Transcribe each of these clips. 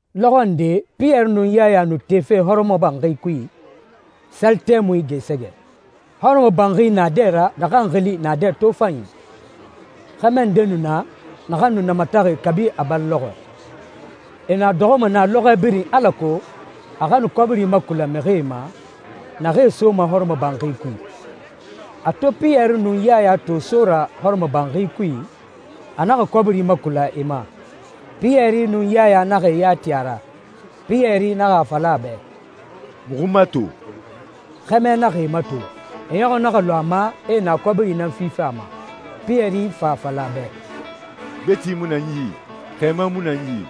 Lɔxɔ nde Piyɛri nun Yaya nu tefe hɔrɔmɔbanxi kui, sali tɛmui gɛɛsɛgɛ. Hɔrɔmɔbanxi naadɛ ra naxan xili «Naadɛ Tofanyi», xɛmɛ nde nu na naxan nu namataxi kabi a bari lɔxɔɛ. E nu a dɔxɔma na lɔxɔɛ birin alako a xa nu kɔbiri makula mixie ma naxee soma hɔrɔmɔbanxi kui. A to Piyɛri nun Yaya to so ra hɔrɔmɔbanxi kui, a naxa kɔbiri makula e ma. Piyɛri nun Yaya naxa e ya ti a ra. Piyɛri naxa a fala a bɛ, «Muxu mato.» Xɛmɛ naxa e mato, a ɲɔxɔ naxa lu a ma e na kɔbiri nan fife a ma. Piyɛri fa a fala a bɛ, «Gbeti mu na n yi, xɛɛma mu na n yi,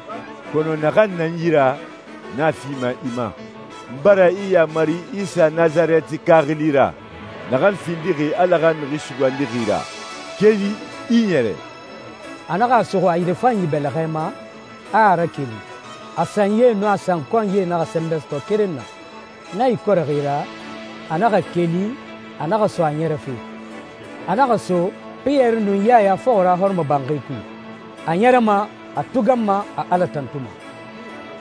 kɔnɔ naxan na n yi ra, n a fima i ma. N bara i yaamari Isa Nasarɛtika xili ra, naxan findixi Ala xa Mixi Sugandixi ra, keli, i i ɲɛrɛ!» A naxa a suxu a yirefanyi bɛlɛxɛ ma, a a rakeli. A sanyie nun a sankɔnyie naxa sɛnbɛ sɔtɔ keren na. Na ikɔrɛxi ra, a naxa keli, a naxa so a ɲɛrɛfe. A naxa so Piyɛri nun Yaya fɔxɔ ra hɔrɔmɔbanxi kui. A ɲɛrɛma, a tuganma, a Ala tantuma.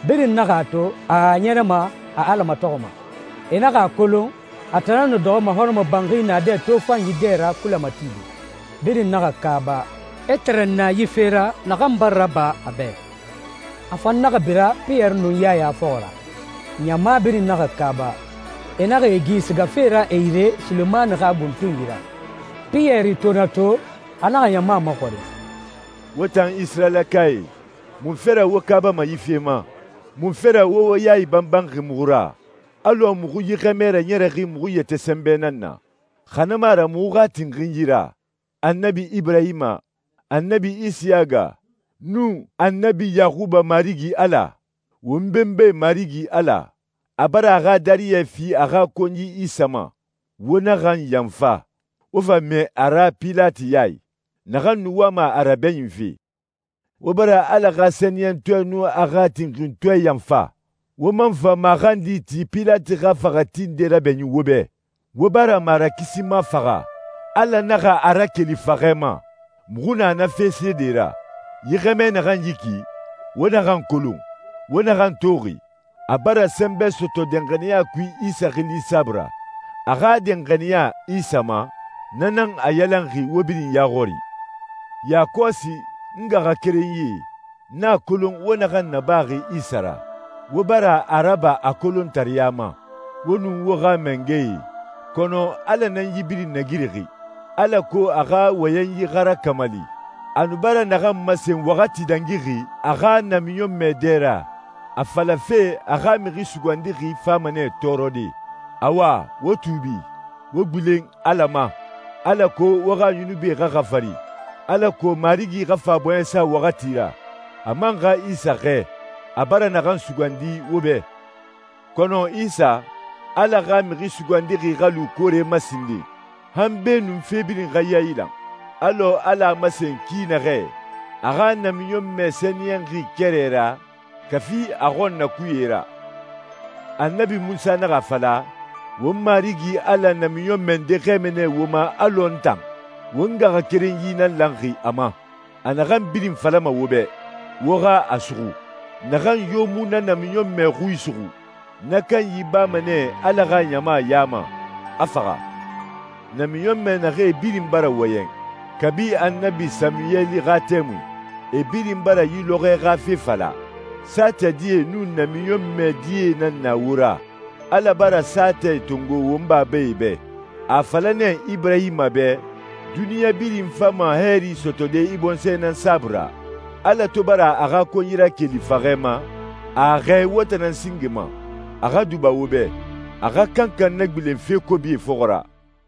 Birin naxa a to, a a ɲɛrɛma, a Ala matɔxɔma. E naxa a kolon a tan nan nu dɔxɔma hɔrɔmɔbanxi «Naadɛ Tofanyi» dɛ ra kulɛ matide. Birin naxa kaaba, e tɛrɛnna yi fe ra naxan bara raba a bɛ. A fan naxa bira Piyɛri nun Yaya fɔxɔ ra. Ɲama birin naxa kaaba, e naxa e gi sigafe ra e yire Sulemani xa buntunyi ra. Piyɛri to na to, a naxa ɲama maxɔrin, «Wo tan Isirayilakae, munfe ra wo kaabama yi fe ma? Munfe ra wo wo yae banbanxi muxu ra alɔ muxu yi xɛmɛ raɲɛrɛxi muxu yɛtɛ sɛnbɛ nan na, xa na mu a ra muxu xa tinxinyi ra? Annabi Iburahima, Annabi Isiyaga, nun Annabi Yaxuba Marigi Ala, won benbae Marigi Ala, a bara a xa dariyɛ fi a xa konyi Isa ma, wo naxan yanfa, wo fa mɛɛ a ra Pilati ya i, naxan nu wama a rabɛɲinfe. Wo bara Ala xa sɛniyɛntɔɛ nun a xa tinxintɔɛ yanfa. Wo man fa maxandi ti Pilati xa faxɛti nde rabɛɲin wo bɛ. Wo bara Marakisima faxa, Ala naxa a rakeli faxɛ ma. Muxu na na fe seede ra. Yi xɛmɛ naxan yi ki, wo naxan kolon, wo naxan toxi, a bara sɛnbɛ sɔtɔ danxaniya kui Isa xili saabui ra. A xa danxaniya Isa ma, na nan a yalanxi wo birin ya xɔri.» «Yakɔsi, n ngaxakerenyie, n a kolon wo naxan nabaxi Isa ra, wo bara a raba a kolontareya ma, wo nun wo xa mangɛe. Kɔnɔ Ala nan yi birin nagirixi, alako a xa wɔyɛnyi xa rakamali, a nu bara naxan masen waxati dangixi a xa namiɲɔnmɛe dɛ ra, a falafe a a xa Mixi Sugandixi fama nɛ tɔɔrɔde. Awa, wo tuubi, wo gbilen Ala ma, alako wo xa yunubie xa xafari, alako Marigi xa fa bɔɲɛsa waxati ra, a man xa Isa xɛɛ, a bara naxan sugandi wo bɛ. Kɔnɔ Isa, Ala xa Mixi Sugandixi xa lu koore ma sinden, han beenun fe birin xa yailan, alɔ Ala a masen ki naxɛ a xa namiɲɔnmɛ sɛniyɛnxie kɛrɛ ra kafi a xɔnnakuye ra.» «Annabi Munsa naxa a fala, ‹Wo Marigi Ala namiɲɔnmɛ nde xɛɛma nɛ wo ma alɔ n tan. Won ngaxakerenyi nan lanxi a ma. A naxan birin falama wo bɛ, wo xa a suxu. Naxan yo mu na namiɲɔnmɛ xui suxu, na kanyi bama nɛ Ala xa ɲama ya ma, a faxa.›» «Namiɲɔnmɛ naxee birin bara wɔyɛn kabi Annabi Samuweli xa tɛmui, e birin bara yi lɔxɔɛe xa fe fala. Saatɛ die nun namiɲɔnmɛ die nan na wo ra. Ala bara saatɛ tongo won babae bɛ. A a fala nɛ Iburahima bɛ, ‹Duniɲa birin fama hɛɛri sɔtɔde i bɔnsɔɛ nan saabui ra.› Ala to bara a xa konyi rakeli faxɛ ma, a a xɛɛ wo tan nan singe ma, a xa duba wo bɛ, a xa kankan nagbilen fe kobie fɔxɔ ra.»